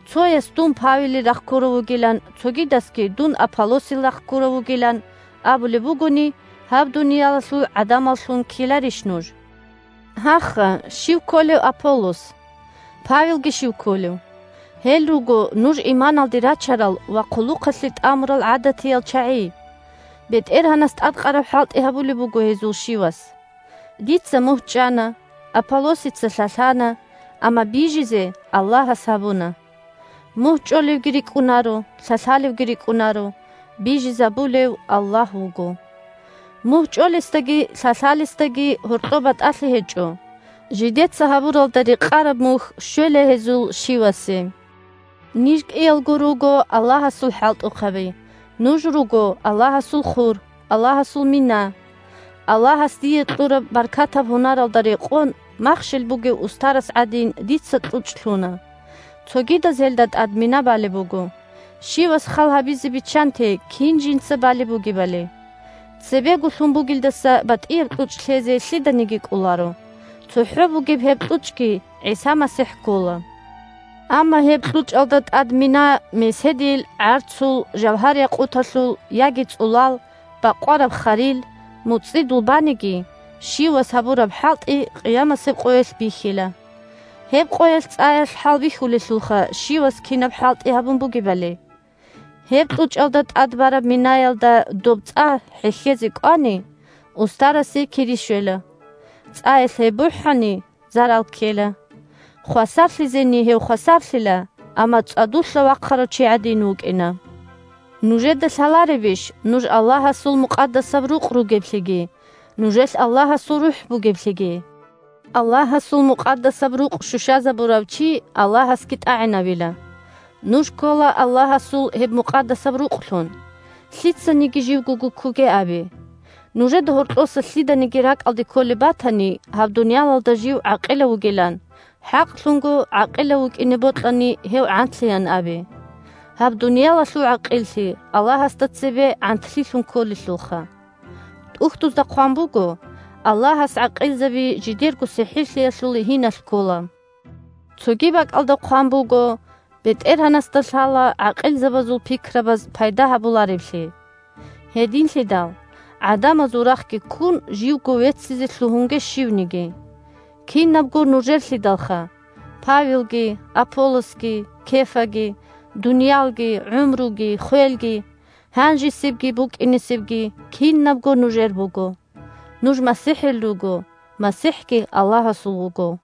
Цояс «дун Павелил рахъ ккурав вугилан», цогидасги «дун Аполлосил рахъ ккурав вугилан» абулеб бугони, гьаб дуниялалъул гӀадамаллъун ккеларищ нуж? Гьаха, щив кколев Аполлос? Павелги щив кколев? Гьел руго нуж иманалде рачарал ва хъулухъалъе тӀамурал гӀадатиял чагӀи. БетӀергьанас тӀадкъараб хӀалтӀи гьабулеб буго гьезул щивас. Дица мугь чӀана, Аполлосица лъалъана, амма бижизе Аллагьас гьабуна. Мугь чӀолевги – рикӀкӀунаро, лъалъалевги – рикӀкӀунаро. Бижизабулев – Аллагь вуго! Мугь чӀолесдаги лъалъалесдаги гьоркьоб батӀалъи гьечӀо. Жидеца гьабуралда рекъараб мухь щвела гьезул щивасе. Ниж кӀиялго руго Аллагьасул хӀалтӀухъаби, нуж руго Аллагьасул хур, Аллагьасул мина. Аллагьас дие кьураб баркатаб гьунаралда рекъон, махщел бугев устарас гӀадин, дица кьучӀ лъуна. Цогидаз гьелда тӀад мина балеб буго. Щивас хал гьабизе биччанте кин жинца балеб бугебали. Цебего лъун бугелдаса батӀияб кьучӀ лъезе лъиданиги кӀоларо. ЦохӀо бугеб гьеб кьучӀги ГӀиса МасихӀ ккола. Амма гьеб кьучӀалда тӀад мина меседил, гӀарцул, жавгьар-якъуталъул, яги цӀулал, бакъвараб харил, муцӀидул баниги, щивас гьабураб хӀалтӀи къиямасеб къоялъ бихьила. Гьеб къоялъ цӀаялъ хӀалбихьулелъулха щивас кинаб хӀалтӀи гьабун бугебали. Гьеб кьучӀалда тӀад бараб минаялда доб цӀа хӀехьезе кӀвани, устарасе кири щвела. ЦӀаялъ гьеб бухӀани, зарал ккела. Хвасарлъизени гьев хвасарлъила, амма цӀадулъа вахъарав чи гӀадин вукӀина. Нужеда лъаларебищ нуж Аллагьасул мукъадасаб рукъ ругеблъиги нужелъ Аллагьасул РухӀ бугеблъиги? Аллагьасул мукъадасаб рукъ щущазабурав чи Аллагьасги тӀагӀинавила. Нуж ккола Аллагьасул гьеб мукъадасаб рукълъун. Лъицаниги живго гуккуге абе! Нужеда гьоркьоса лъиданиги ракӀалде кколеб батани гьаб дуниялалда жив гӀакъилав вугилан, хӀакълъунго гӀакъилав вукӀине бокьани, гьев гӀантлъеян абе. Гьаб дуниялалъул гӀакъиллъи Аллагьасда цебе гӀантлъилъун кколелъулха. ТӀухьдузда хъван буго: «Аллагьас гӀакъилзаби жидерго сихӀирлъиялъул гьиналъ ккола». Цоги бакӀалда хъван буго: «БетӀергьанасда лъала гӀакъилазул пикрабаз пайда гьабулареблъи». Гьединлъидал, гӀадамазул рахъги ккун, живго веццизе лъугьунге щивниги. Кинабго нужерлъидалха: Павелги, Аполлосги, Кефаги, дуниялги, гӀумруги, хвелги, гьанжесебги, букӀинесебги – кинабго нужер буго. Нуж МасихӀил руго, МасихӀги Аллагьасул вуго!